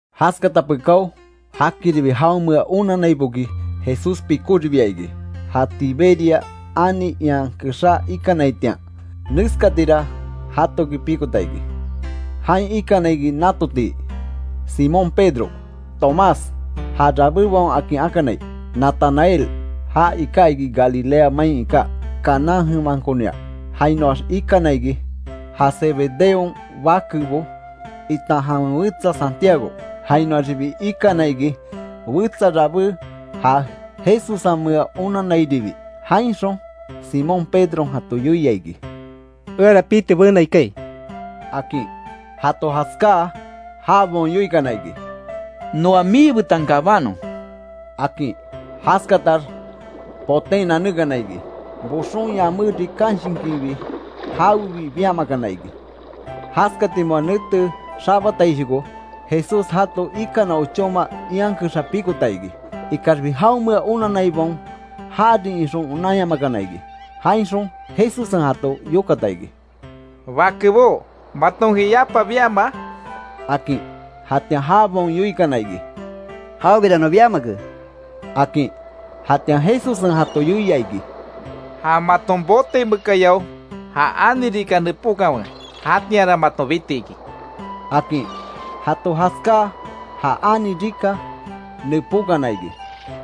Jaskata pekáo, jakiribi jaonmea onanaiboki Jesús pikóribia iki, ja Tiberia ani ian kexá iikanaitian. Neskatira jatoki pikota iki: Jain ikana iki natotii, Simón Pedro, Tomás, ja Rabébaon akin akanai, Natanael, ja iká iki Galilea main iká Caná jemankonia, jainoax ikana iki, ja Zebedeon bakebo itan jawen wetsa Santiago, jainoaxibi ikana iki wetsa rabé ja Jesussenmea onanairibi. Jainxon Simón Pedron jato yoia iki: —Eara piti benai kaai —akin. Jato jaskáa jabaon yoikana iki: —Noa miibetan kabánon —akin. Jaskatax boten nanekana iki, boxon yamé rikanshinkinbi jawebi biamakana iki. Jaskati moa nete xabataishoko Jesús jato ikana ochóma ian kexa pikota iki, ikaxbi jaonmea onanaibaon jarin ixon, onanyamakana iki. Jainxon Jesussen jato yokata iki: —Bakebó, matonki yapa biamaa —akin. Jatian jabaon yoikana iki: —Jawebira non biamake —akin. Jatian Jesussen jato yoia iki: —Ja maton bote mekayao ja ani rika nepókanwe, jatianra maton bitiki —akin. Jato jaskáa ja ani rika nepókana iki,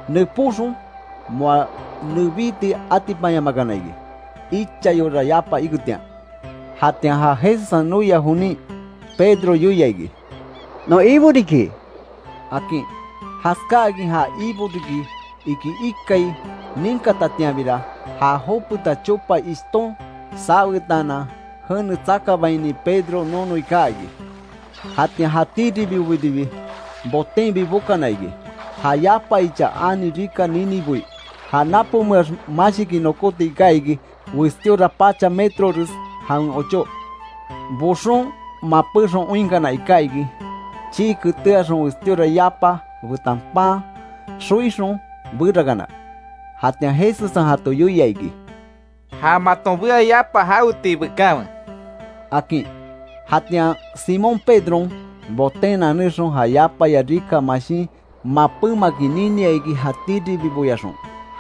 nepóxon moa nebíti atipanyamakana iki ichayora yapa iketian. Jatian ja Jesussen noia jonin, Pedro yoia iki: —¡Non Ibo riki! —akin. Jaskáakin ja Ibo riki iki ikai ninkatatianbira, ja jopeta chopa ishton sawetaanan jene tsakabaini Pedro nonoi kaa iki. Jatian jatíribibobiribi botenbi bokana iki, ja yapa ichaya ani rika niniboi. Ja napomeax mashiki nokóti iká iki westíora pacha metrores jawen ochó. Boxon mapéxon oinkana iká iki, chii ketéaxon westíora yapa betan pan xoikin berakana. Jatian Jesussen jato yoia iki: —Ja maton bea yapa jawetii bekanwe —akin. Jatian Simón Pedron, boten nanexon ja yapaya rika mashin mapémakin ninia iki, jatíribiboyaxon.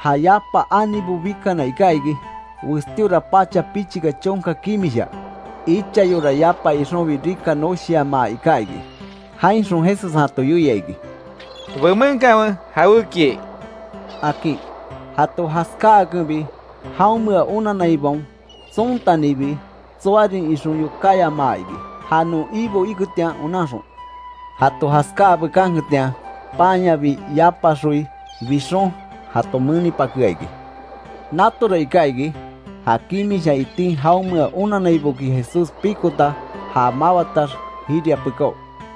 Ja yapa anibo bikana iká iki, westíora pacha pichika chonka kimisha. Ichayora yapa ixonbi rika noshiamaa iká iki. Jainxon Jesussen jato yoia iki: —Bemenkanwe jawékiai —akin. Jato jaskáakenbi jaonmea onanaibaon tsontanibi, tsoarin ixon yokáyamaa iki, ja non Ibo iketian onanxon. Jato jaskáa bekanketian, panyabi yapa xoi bixon jato menipakea iki. Natora iká iki, ja kimisha itin jaonmea onanaiboki Jesús pikota ja mawatax jiria pekáo.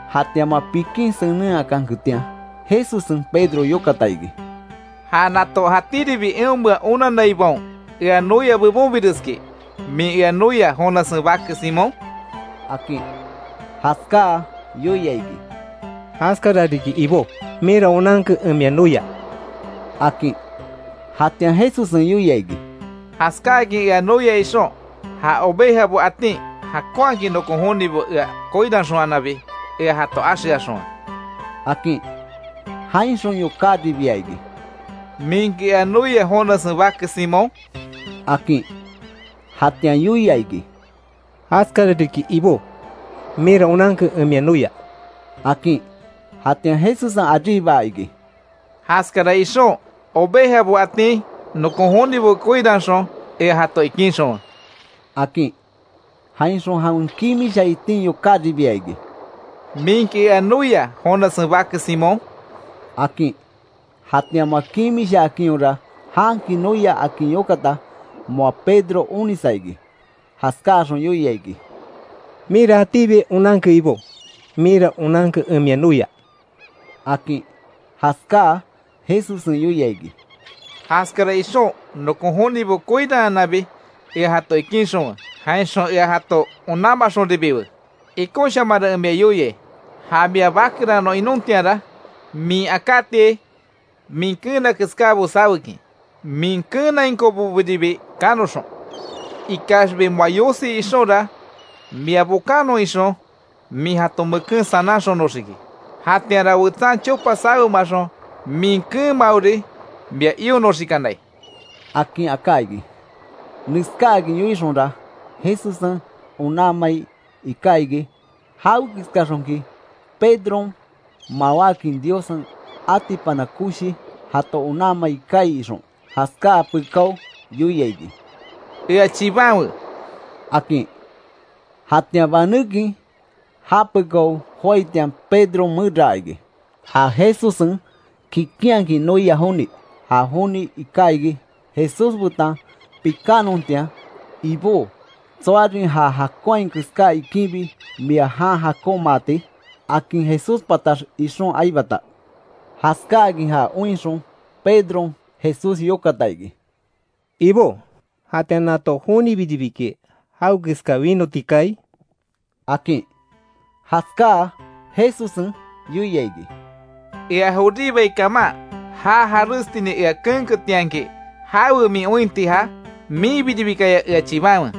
Jatian moa pikin senenhakanketian, Jesussen Pedro yokata iki: —¿Ja nato jatíribi eonmea onanaibaon ea noia bebonbireski, min ea noia Jonassen bake Simón? —akin. Jaskáa yoia iki: —Jaskara riki Ibó, minra onanke, en mia noia —akin. Jatian Jesussen yoia iki: —Jaskáakin ea noia ixon, ja ovejabo atin jakonhakin nokon jonibo ea koiranxonhananbi ea jato axeaxonwe —akin. Jainxon yokáribia iki: —¿Minki ea noia Jonassen bake Simón? —akin. Jatian yoia iki: —Jaskara riki Ibó, minra onanke en mia noia —akin. Jatian Jesussen aríbaa iki: —Jaskara ixon ovejabo atin, nokon jonibo koiranxon ea jato ikinxonwe —akin. Jainxon jawen kimisha itin yokáribia iki: —¿Minki ea noia Jonassen bake Simón? —akin. Jatian moa kimishaakinhora, janki noia akin yokata, moa Pedro onisa iki, jaskáaxon yoia iki: —Minra jatíbi onanke Ibó, minra onanke en mia noia —akin. Jaskáa Jesussen yoia iki: —Jaskara ixon nokon jonibo koiranhananbi ea jato ikinxonwe jainxon ea jato onanmaxonribiwe. Ikonshamanra en mia yoiai, ja mia bakeranon inontianra min akátiai min keena keskábo sawekin, min keenainkobobiribi kanoxon. Ikaxbi moa yosi ixonra mia bokanon ixon, min jato meken sananxonoxiki, jatianra wetsan chopa sawemaxon, min keenmaori mia ionoxikanai —akin aká iki. Neskáakin yoixonra, Jesussen onanmai iká iki, jawekeskaxonki Pedron mawákin Diossen atipana koshi jato onanmai kaai ixon, jaskáa pekáo yoia iki: —¡Ea chibanwe! —akin. Jatian banékin ja pekao joaitian Pedron meraa iki, ja Jesussen kikinhakin noia joni. Ja joni iká iki Jesús betan pikánontian, “Ibó, ¿Tsoarin ja jakonhai keská iikinbi mia jan jakonmaati?” akin Jesús patax ixon aibata. Jaskáakin ja oinxon, Pedron Jesús yokata iki: —Ibó, ¿Jatian nato jonibiribiki jawekeska winoti kaai? —akin. Jaskáa Jesussen yoia iki: —Ea joribai kaman, já jarestinin ea keenketianki, ¿Jawe min ointi ja? Minbiribikaya ea chibanwe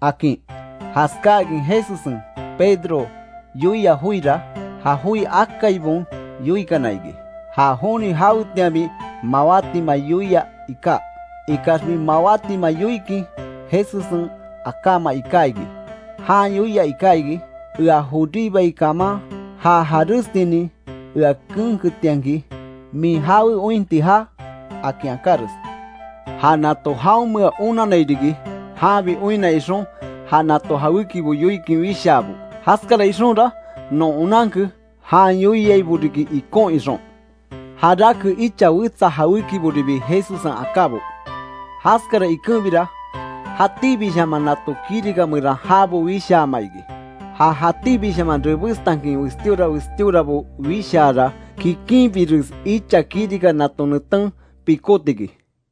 —akin. Jaskáakin Jesussen Pedro yoia joira, ja joi akaibaon yoikana iki, ja joni jawetianbi mawátima yoia iká. Ikaxbi mawátima yoikin Jesussen akáma iká iki, jan yoia iká iki, ea joribai kaman já jarestinin ea keenketianki ¿Min jawen ointi ja? akin akáres. Ja nato jaonmea onanai riki, janbi oinna ixon ja nato jawékibo yoikin wishaabo, jaskara ixonra non onanke jan yoiaibo riki ikon ixon. Jarake icha wetsa jawékiboribi Jesussen akábo. Jaskara ikenbira jatíbishaman nato kirika meran jabo wishaama iki. Ja jatíbishaman rebestankin westíora westíorabo wishaara, kikinbires icha kirika nato neten pikóti iki.